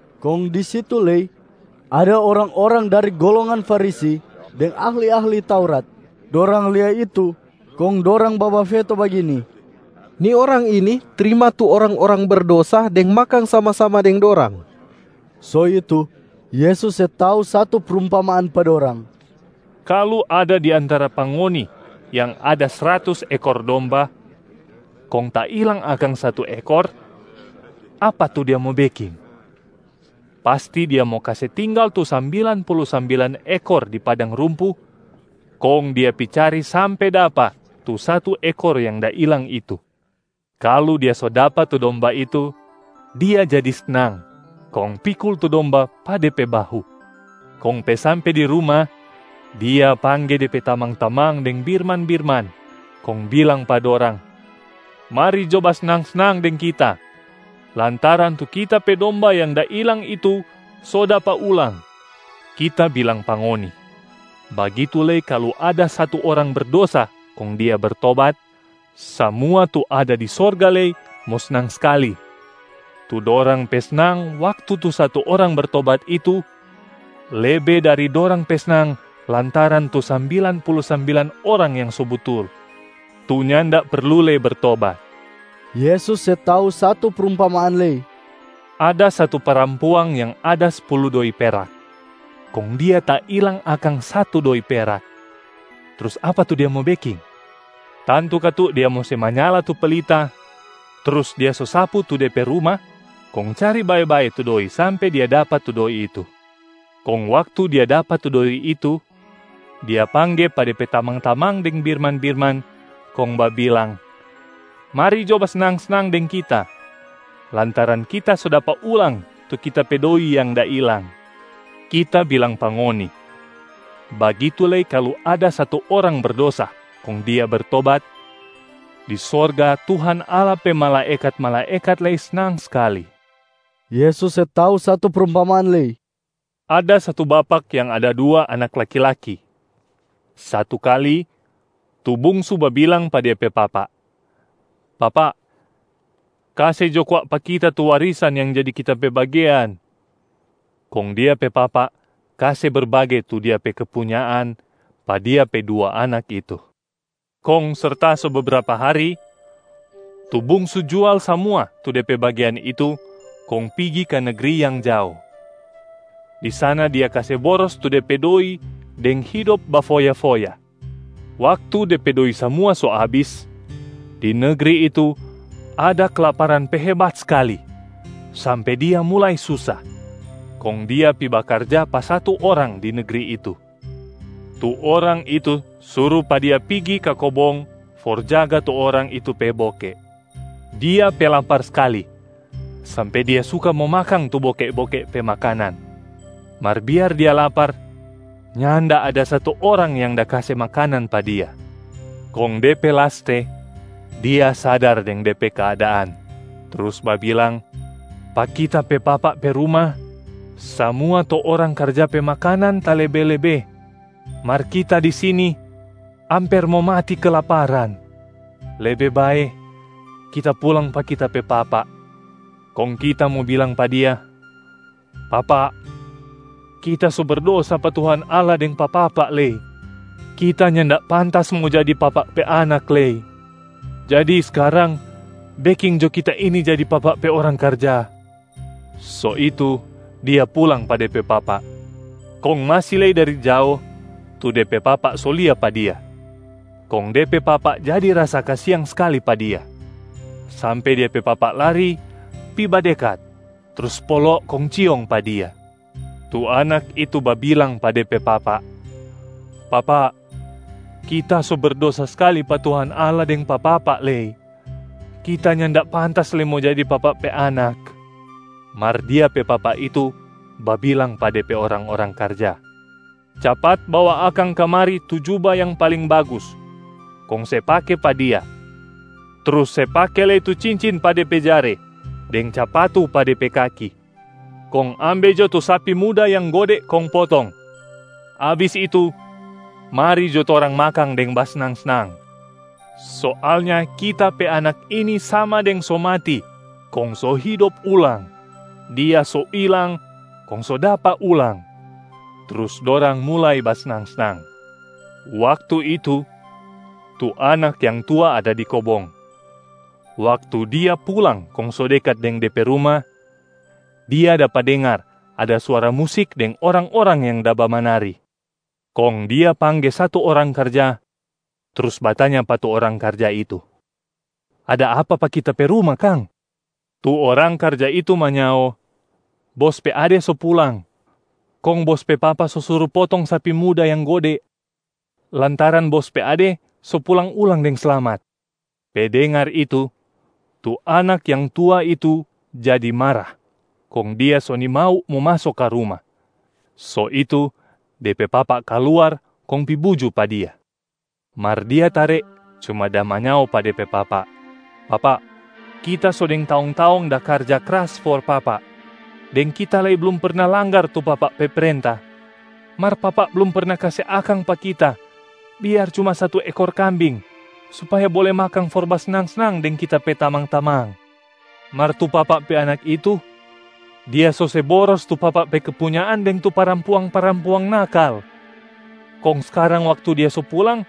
Kong di situ lei ada orang-orang dari golongan Farisi deng ahli-ahli Taurat. Dorang lia itu kong dorang babafeto bagini, “Ni Orang ini trima tu orang-orang berdosa deng makang sama-sama deng dorang.” So itu, Yesus se tau satu prumpamaan pa dorang, “Kalu ada di antara pa ngoni yang ada sratus ekor domba, kong tailang akang satu ekor, apa tu dia mo beking? Pasti dia mo kase tinggal tu sambilan pulu sambilan ekor di padang rumpu kong dia pi cari sampe dapa tu satu ekor yang da ilang itu. Kalu dia so dapa tu domba itu, dia jadi snang kong pikul tu domba pa de pe bahu. Kong pe sampe di ruma, dia pangge de pe tamang-tamang deng birman-birman kong bilang pa dorang, ‘Mari jo basnang-snang deng kita, lantaran tu kita pe domba yang da ilang itu so dapa ulang.’ Kita bilang pa ngoni, bagitu lei kalu ada satu orang berdosa kong dia bertobat, samua tu ada di sorga lei mo snang skali. Tu dorang pe snang waktu tu satu orang bertobat itu, lebe dari dorang pe snang lantaran tu sambilan pulu sambilan orang yang so butul, tu nyanda perlu lei bertobat.” Yesus se tau satu prumpamaan lei, “Ada satu parampuang yang ada spulu doi perak. Kong dia tailang akang satu doi perak. Trus apa tu dia mo beking? Tantu katu dia mo se manyala tu pelita, trus dia sosapu tu de pe ruma kong cari bae-bae tu doi sampe dia dapa tu doi itu. Kong waktu dia dapa tu doi itu, dia pangge pa de pe tamang-tamang deng birman-birman kong babilang, ‘Mari jo basnang-snang deng kita, lantaran kita so dapa ulang tu kita pe doi yang da ilang.’ Kita bilang pa ngoni, bagitu lei kalu ada satu orang berdosa kong dia bertobat, di sorga Tuhan Allah pe malaekat-malaekat lei snang skali.” Yesus se tau satu prumpamaan lei, “Ada satu bapak yang ada dua anak laki-laki. Satu kali, tu bungsu babilang pa dia pe papa, ‘Papa, kase jo kwa pa kita tu warisan yang jadi kita pe bagean!’ Kong dia pe papa kase berbage tu dia pe kepunyaan pa dia pe dua anak itu. Kong serta so bebrapa hari, tu bungsu jual samua tu de pe bagean itu kong pigi ka negri yang jao. Di sana dia kase boros tu de pe doi deng hidop bafoya-foya. Waktu de pe doi samua so abis, di negri itu ada kelaparan pe hebat skali, sampe dia mulai susa. Kong dia pi bakarja pa satu orang di negri itu. Tu orang itu suru pa dia pigi ka kobong for jaga tu orang itu pe boke. Dia pe lapar skali sampe dia suka mo makang tu boke-boke pe makanan. Mar biar dia lapar, nyanda ada satu orang yang da kase makanan pa dia. Kong de pe laste, dia sadar deng de pe keadaan trus babilang, ‘Pa kita pe papa pe ruma, samua tu orang karja pe makanan talebe-lebe, mar kita di sini amper mo mati kelaparan. Lebe bae kita pulang pa kita pe papa, kong kita mo bilang pa dia, “Papa, kita so berdosa pa Tuhan Allah deng pa papa lei. Kita nyanda pantas mo jadi papa pe anak lei. Jadi skarang beking jo kita ini jadi papa pe orang karja.” ’ So itu dia pulang pa de pe papa. Kong masi lei dari jao, tu de pe papa so lia pa dia. Kong de pe papa jadi rasa kasiang skali pa dia, sampe dia pe papa lari pi badekat trus polo kong ciong pa dia. Tu anak itu babilang pa de pe papa, ‘Papa, kita so berdosa skali pa Tuhan Allah deng pa papa lei. Kita nyanda pantas lei mo jadi papa pe anak.’ Mar dia pe papa itu babilang pa de pe orang-orang karja, ‘Capat bawa akang kamari tu juba yang paling bagus kong se pake pa dia. Trus se pake lei tu cincin pa de pe jare deng capatu pa de pe kaki. Kong ambe jo tu sapi muda yang gode kong potong. Abis itu, mari jo torang makang deng basnang-snang. Soalnya kita pe anak ini sama deng so mati kong so hidop ulang. Dia so ilang, kong so dapa ulang.’ Trus dorang mulai basnang-snang. Waktu itu, tu anak yang tua ada di kobong. Waktu dia pulang kong so dekat deng de pe ruma, dia dapa dengar ada suara musik deng orang-orang yang da bamanari. Kong dia pangge satu orang karja trus batanya pa tu orang karja itu, ‘Ada apa pa kita pe ruma kang?’ Tu orang karja itu manyao, ‘Bos pe ade so pulang! Kong bos pe papa so suru potong sapi muda yang gode lantaran bos pe ade so pulang ulang deng slamat.’ Pe dengar itu, tu anak yang tua itu jadi mara kong dia so nimau mo maso ka ruma. So itu de pe papa kaluar kong pi buju pa dia. Mar dia tare cuma da manyao pa de pe papa, ‘Papa, kita so deng taong-taong da karja kras for papa, deng kita lei blum perna langgar tu papa pe prenta. Mar papa blum perna kase akang pa kita biar cuma satu ekor kambing supaya bole makang for basnang-snang deng kita pe tamang-tamang. Mar tu papa pe anak itu, dia so se boros tu papa pe kepunyaan deng tu parampuang-parampuang nakal. Kong skarang waktu dia so pulang,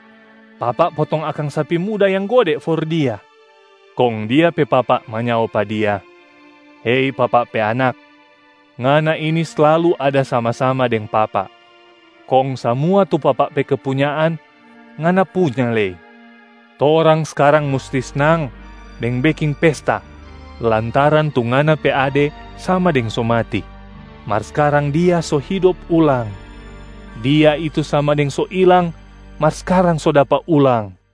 papa potong akang sapi muda yang gode for dia.’ Kong dia pe papa manyao pa dia, ‘Hei papa pe anak, ngana ini slalu ada sama-sama deng papa kong samua tu papa pe kepunyaan, ngana punya lei. Torang skarang musti snang deng beking pesta lantaran tu ngana pe ade sama deng so mati, mar skarang dia so hidop ulang. Dia itu sama deng so ilang mar skarang so dapa ulang.’”